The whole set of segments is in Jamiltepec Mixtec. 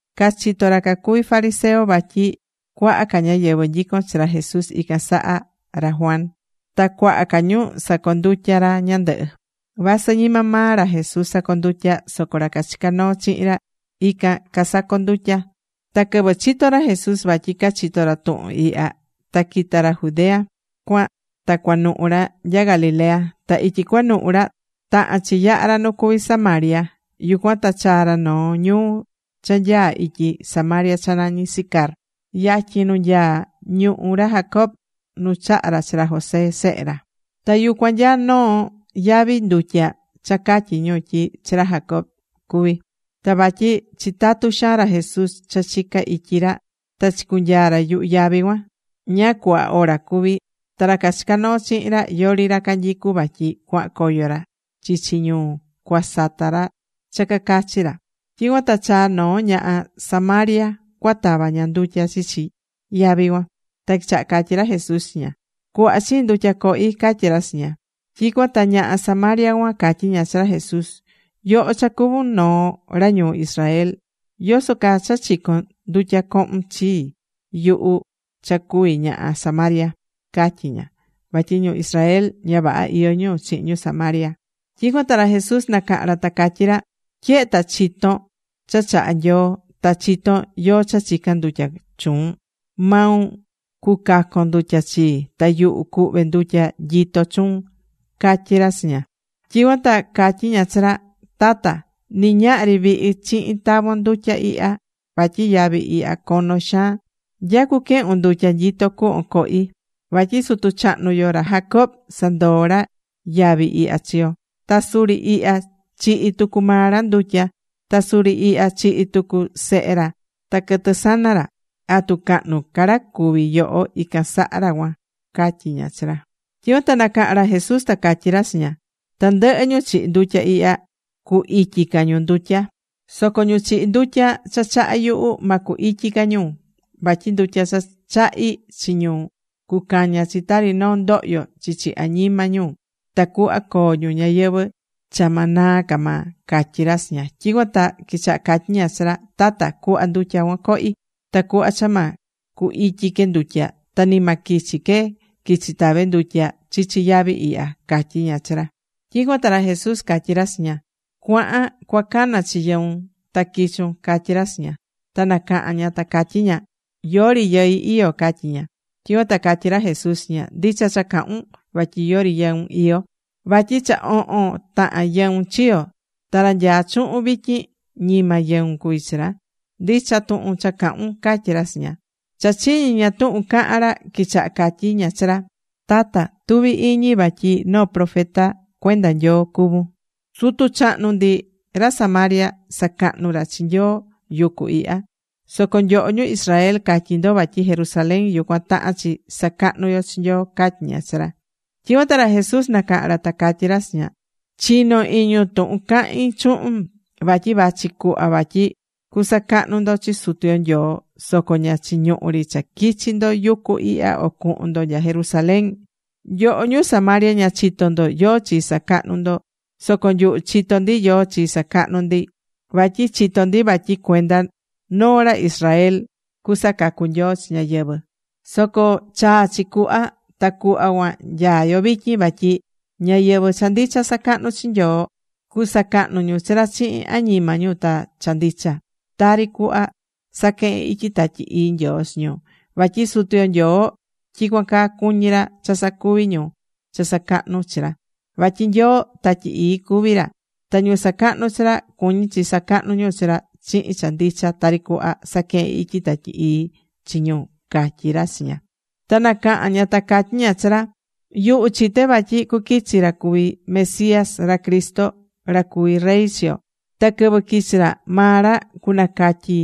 Cachitó ra cuví fariseo vatyi cuaha ca ñáyɨvɨ nyicón chi ra Jesús ican saha ra Juan. Ta cuaha ca ñu sacondutya̱ ra ñandɨhɨ. Vasɨ ñima maa ra Jesús sacondutyá, soco ra cachicá noo chihin ra, ican casacondutyá. Ta quɨvɨ chito̱ ra Jesús vatyi cachito̱ ra tuhun ihya, ta quita̱ ra Judea cuan ta cuanuhu ra nya Galilea. Ta ityi cuanuhu ra, tahan chi yaha ra nu cuví Samaria. Yucuan ta chaa̱ ra noo ñuu cha nyaá ityi Samaria cha nañí Sicar yatyin nu nyaá ñuhú ra Jacob nu chaha̱ ra chi ra José sehe ra. Ta yucuan nyaá noo yavi ndutya cha catyí ñu tyi chi ra Jacob cuví. Ta vatyi chitatú xaan ra Jesús cha chica ityi ra, ta chicunyaa̱ ra yuhu yavi cuan, ñáá cuhva hora cuví. Ta ra cachicá noo chihin ra, yori ra canyicú vatyi cuahan coyo ra chichi ñuu, cuasata ra cha cacachi ra. Tyicuan ta chaa̱ noo ñaha Samaria cuatava ña ndutya chichi yavi cuan. Ta quichaha catyí ra Jesús chi ña: ―Cu̱hva chiin ndutya cohi ―catyí ra chi ña. Tyicuan ta ñaha Samaria cuan catyí ña chi ra Jesús: ―Yoho cha cuvún noo ra ñuu Israel, ¿yoso caa cha chicón ndutya cohun chi yuhu cha cuví ñaha Samaria? ―catyí ña vatyi ñu Israel ña vaha iyó ñu chihin ñu Samaria. Tyicuan ta ra Jesús nacaha̱n ra ta catyí ra: ―Tyehe ta chitón cha chahá Nyoo, ta chitón yóó cha chicán ndutya chuun, maun cucacon ndutya chii. Ta yuhu cuhve ndutya nyitó chuun ―catyí ra chi ña. Tyicuan ta catyí ña chi ra: ―Tata, ni ñahri vihi chihin tavon ndutya ihya. Vatyi yavi ihya cono xaan. ¿Nya cuquehun ndutya nyitó cuhvon cohi? Vatyi sutu chahnu yo, ra Jacob sandoo̱ ra yavi ihya chi yo. Ta suri ihya chihi̱ tucu maa ra ndutya. Ta suri ihya chihi̱ tucu sehe ra ta quɨtɨ sana ra. ¿Atu cahnu ca ra cuví yoho ican saha ra cuan? ―catyí ña chi ra. Tyicuan ta nacaha̱n ra Jesús ta catyí ra chi ña: ―Tandɨhɨ ñu chihí ndutya ihya, cu ityi ca ñu ndutya. Soco ñu chihí ndutya cha chahá yuhu, ma cu ityi ca ñu. Vatyi ndutya cha chahí chi ñu cucaña chi tari noo ndohyo chichi añima ñu tacuhva coo ñu ñayɨvɨ̱ cha ma naa ca maa ―catyí ra chi ña. Tyicuan ta quichaha catyí ña chi ra: ―Tata, cu̱hva ndutya cuan cohí, tacuhva cha ma cu ityi que ndutya, ta ni ma quichi que quichi tave ndutya chichi yavi ihya ―catyí ña chi ra. Tyicuan ta ra Jesús catyí ra chi ña: ―Cua̱han cuacana chi yɨun ta qui̱chun ―catyí ra chi ña. Ta nacaha̱n ña ta catyí ña: ―Yori yɨi iyó ―catyí ña. Tyicuan ta catyí ra Jesús chi ña: ―Ndicha cha cahun, vatyi yori yɨun iyó. Vatyi cha ohon tahan yɨun chiyo̱, ta ra nyaá chuhun vityin ñima yɨun cuví chi ra. Ndicha tuhun cha cahún ―catyí ra chi ña. Cha chiñi̱ ña tuhun caha̱n ra, quichaha catyí ña chi ra: ―Tata, tuví iñi vatyi noo profeta cuenda Nyoo cuvún. Sutu chahnu ndi, ra Samaria, sacahnu̱ ra chi Nyoo yucu ihya. Soco nyoho ñu Israel catyí ndo vatyi Jerusalén yucuan tahán chi sacahnu yo chi Nyoo ―catyí ña chi ra. Tyicuan ta ra Jesús nacaha̱n ra ta catyí ra chi ña: ―Chi̱no iñun tuhun cahín chuhun. Vatyi vachi cuhva vatyi cusacahnu ndo chi Sutu yo Nyoo. Soco ña chiñuhú ri cha quichi ndo yucu ihya o cuhun ndo nya Jerusalén. Nyoho ñu Samaria, ña chitó ndo yóó chi sacahnú ndo. Soco nyuhu chitó ndi yóó chi sacahnú ndi. Vatyi chitó ndi vatyi cuenda noo ra Israel cuasacacu Nyoo chi ñáyɨvɨ. Soco chaa chi cuhva ta cuhva cuan nyaa yo vityin vatyi ñáyɨvɨ cha ndicha sacahnú chi Sutu yo Nyoo, cusacahnu ñu chi ra chihin añima ñu ta cha ndicha. Tari cuhva saquehen ityi Tatyi Ii Nyoo chi ñu. Vatyi Sutu yo Nyoo tyicuan caa cuñí ra cha sacuvi ñu cha sacahnú chi ra. Vatyi Nyoo Tatyi Ii cuví ra. Ta ñu sacahnú chi ra cuñí chi sacahnú ñu chi ra chihin cha ndicha tari cuhva saquehen ityi Tatyi Ii chi ñu ―catyí ra chi ña. Ta nacaha̱n ña ta catyí ña chi ra: ―Yuhu chité vatyi cuquichi ra cuví Mesías, ra Cristo, ra cuvi rey chi yo. Ta quɨvɨ quichi ra, maa ra cunacatyi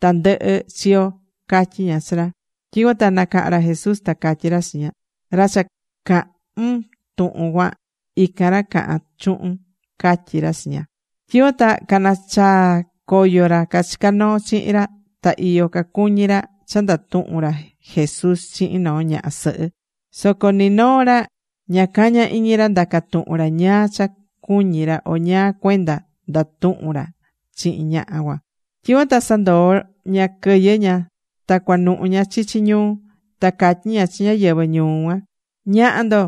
tandɨhɨ chi yo ―catyí ña chi ra. Tyicuan ta nacaha̱n ra Jesús ta catyí ra chi ña: ―Ra cha cahún tuhun cuan, ican ra cahán chuhun ―catyí ra chi ña. Tyicuan ta canachaa̱ coyo ra cachicá noo chihin ra ta iyo cacuñí ra cha ndatuhún ra Jesús chihin noo ñaha sɨhɨ. Soco ni noo ra ña cañá iñi ra ndaca tuhun ra ñáá cha cuñí ra o ñáá cuenda ndatuhún ra chihin ñaha cuan. Tyicuan ta sandoo̱ ña quɨyɨ ña ta cuanuhu ña chichi ñuu. Ta catyí ña chi ñáyɨvɨ ñuu ña: ―Ña̱ha ndo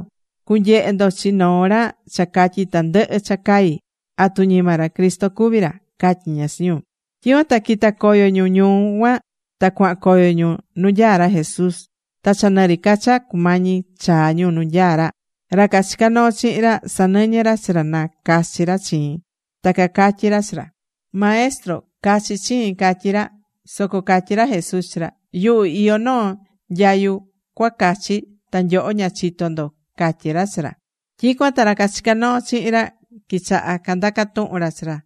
cunyehe ndo chi noo ra cha catyi̱ tandɨhɨ cha cai. ¿Atu ñima ra Cristo cuví ra? ―catyí ña chi ñu. Tyicuan ta quita̱ coyo ñu ñuu cuan ta cuahan coyo ñu nu nyaá ra Jesús. Ta cha nɨri ca cha cumañi chaa ñu nu nyaá ra, ra cachicá noo chihin ra, sanɨñɨ́ ra chi ra na cachi ra chiin. Ta cacatyí ra chi ra: ―Maestro, ca̱chi chiin ―catyí ra. Soco catyí ra Jesús chi ra: ―Yuhu iyó noo nyayu cuacachi, ta nyoho ña chitó ndo ―catyí ra chi ra. Tyicuan ta ra cachicá noo chihin ra quichaha candaca tuhun ra chi ra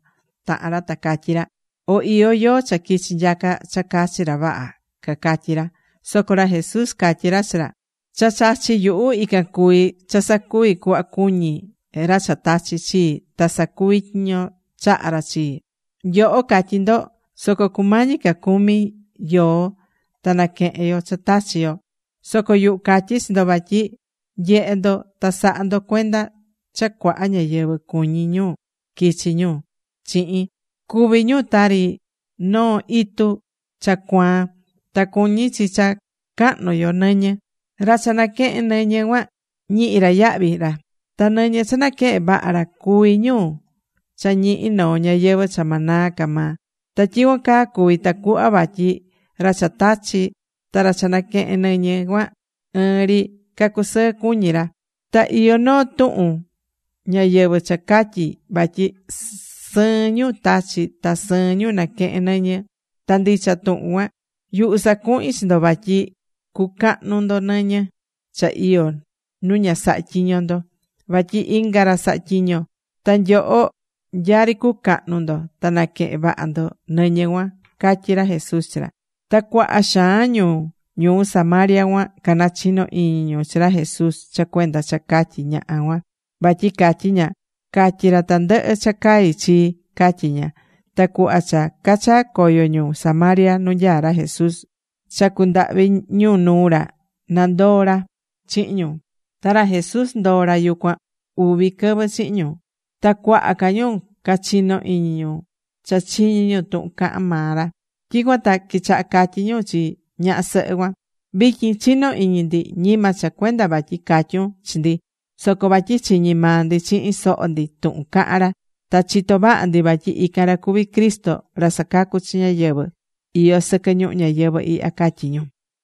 tahan ra, ta catyí ra: ―¿O iyó yóó cha quichi̱ nyaca cha cachi ra, vaha? ―cacatyí ra. Soco ra Jesús catyí ra chi ra: ―Cha chachí yuhu ican cuví cha sacuví cuhva cuñí ra cha tachi̱ chii ta sacuví tyiño chaha̱ ra chii. Nyoho catyí ndo: “Soco cumañi ca cumi yoo ta naquehen yo cha tachi̱ yo.” Soco yuhu catyí chi ndo vatyi nye̱he ndo ta sa̱ha ndo cuenda cha cuaha ñáyɨvɨ cuñí ñu quichi ñu chihin, cuví ñu tari noo itu cha cuaan ta cuñí chi cha cahnu yo nɨñɨ. Ra cha naquehén nɨñɨ cuan ñihi ra yahvi ra. Ta nɨñɨ cha naquehen vaha ra cuví ñu cha ñihi noo ñayɨvɨ̱ cha ma naa ca maa. Ta tyicuan caa cuví tacuhva vatyi ra cha tachí, ta ra cha naquehén nɨñɨ cuan ɨɨn ri cacusɨɨ cuñi ra. Ta iyó noo tuhun ñayɨvɨ̱ cha catyí vatyi sɨɨn ñu tachí ta sɨɨn ñu naquehén nɨñɨ. Ta ndicha tuhun cuan. Yuhu sacuhi̱n chi ndo vatyi cucahnu ndo nɨñɨ cha iyó nu ña saha̱ tyiño ndo. Vatyi inga ra saha̱ tyiño. Ta nyoho nyari cucahnu ndo ta naquehen vaha ndo nɨñɨ cuan ―catyí ra Jesús chi ra. Ta cuaha xaan ñu ñuu Samaria cuan canachino̱ iñi ñu chi ra Jesús cha cuenda cha catyi̱ ñaha cuan, vatyi catyí ña: “Catyi̱ ra tandɨhɨ cha cai chii”, catyí ña. Ta cuhva cha cachaa̱ coyo ñu Samaria nu nyaá ra Jesús, cha cundahvi̱ ñu nuu ra nandoo ra chihin ñu. Ta ra Jesús ndoo̱ ra yucuan uvi quɨvɨ chihin ñu. Ta cuaha ca ñu cachino̱ iñi ñu cha chiñi̱ ñu tuhun cahán maa ra. Tyicuan ta quichaha catyí ñu chi ñaha sɨhɨ cuan: ―Vityin chinó iñi ndi, ñima cha cuenda vatyi catyun chi ndi, soco vatyi chiñi̱ maa ndi chihin soho ndi tuhun cahán ra, ta chitó vaha ndi vatyi ican ra cuví Cristo ra sacacú chi ñáyɨvɨ iyó sɨquɨ ñuhu ñayɨvɨ̱ ihya ―catyí ñu.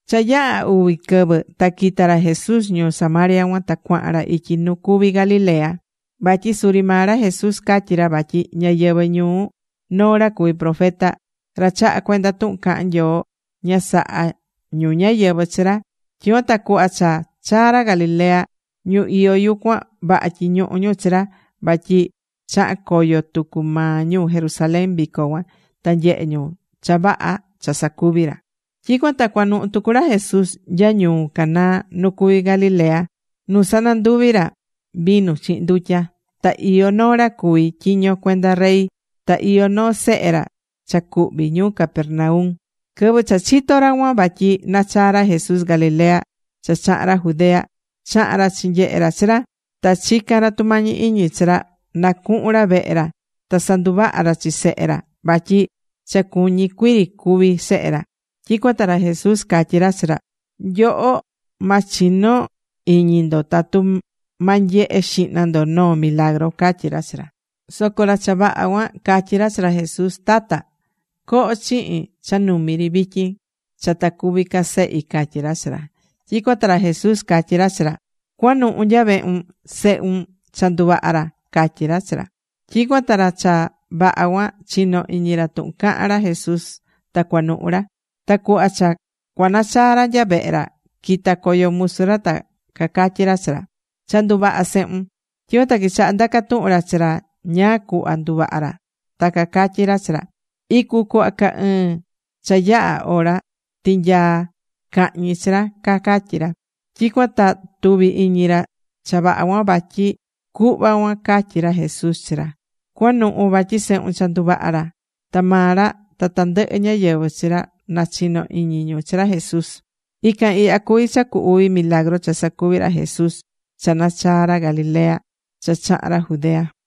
Cha yaha̱ uvi quɨvɨ ta quita̱ ra Jesús ñuu Samaria cuan ta cuahan ra ityi nu cuví Galilea. Vatyi suri maa ra Jesús catyi̱ ra vatyi ñáyɨvɨ ñuu noo ra cuví profeta, ra chahá cuenda tuhun cahán Nyoo, ña sahá ñu ñáyɨvɨ chi ra. Tyicuan ta cuhva cha chaa̱ ra Galilea, ñu iyó yucuan vaha tyiñuhu̱ ñu chi ra, vatyi chaha̱n coyo tucu maa ñu Jerusalén vico cuan, ta nyehe̱ ñu cha vaha cha sacuvi̱ ra. Tyicuan ta cuanuhu tucu ra Jesús nya ñuu Caná nu cuví Galilea nu sananduvi̱ ra vinu chihin ndutya. Ta iyó noo ra cuví tyiño cuenda rey, ta iyó noo sehe ra cha cuhví ñuu Capernaum. Quɨvɨ cha chito̱ ra cuan vatyi nachaa̱ ra Jesús Galilea cha chaha̱n ra Judea, chaha̱n ra chinyehe̱ ra chi ra, ta chica̱n ra tumañi iñi chi ra na cuhun ra vehe ra ta sanduvaha ra chi sehe ra, vatyi cha cuñí cuii ri cúvi sehe ra. Tyicuan ta ra Jesús catyí ra chi ra: ―Nyoho ma chino iñi ndo tatu ma nyehe xihna ndo noo milagru ―catyí ra chi ra. Soco ra cha vaha cuan catyí ra chi ra Jesús: ―Tata, co̱ho chihin cha numi ri vityin cha ta cúvi ca sehi ―catyí ra chi ra. Tyicuan ta ra Jesús catyí ra chi ra: ―Cua̱nuhu nya vehun. Sehun cha nduvaha̱ ra ―catyí ra chi ra. Tyicuan ta ra cha vaha cuan chinó iñi ra tuhun caha̱n ra Jesús ta cuanuhu̱ ra. Ta cuhva cha cuanachaa ra nya vehe ra, quita̱ coyo musu ra ta cacatyí ra chi ra: ―¡Cha nduvaha̱ sehun! Tyicuan ta quichaha ndaca̱ tuhun ra chi ra ñáá cuhva nduvaha ra. Ta cacatyí ra chi ra: ―Icu cuhva ca ɨɨn cha yaha̱ hora tinyaa̱ cahñi chi ra ―cacatyí ra. Tyicuan ta tuví iñi ra cha vaha cuan, vatyi cuhva cuan catyí ra Jesús chi ra, “Cua̱nuhu vatyi sehun cha nduvaha̱ ra.” Ta maa ra ta tandɨhɨ ñáyɨvɨ chi ra nachino̱ iñi ñu chi ra Jesús. Ican ihya cuví cha cu uvi milagru cha sacuvi̱ ra Jesús cha nachaa̱ ra Galilea cha chaha̱n ra Judea.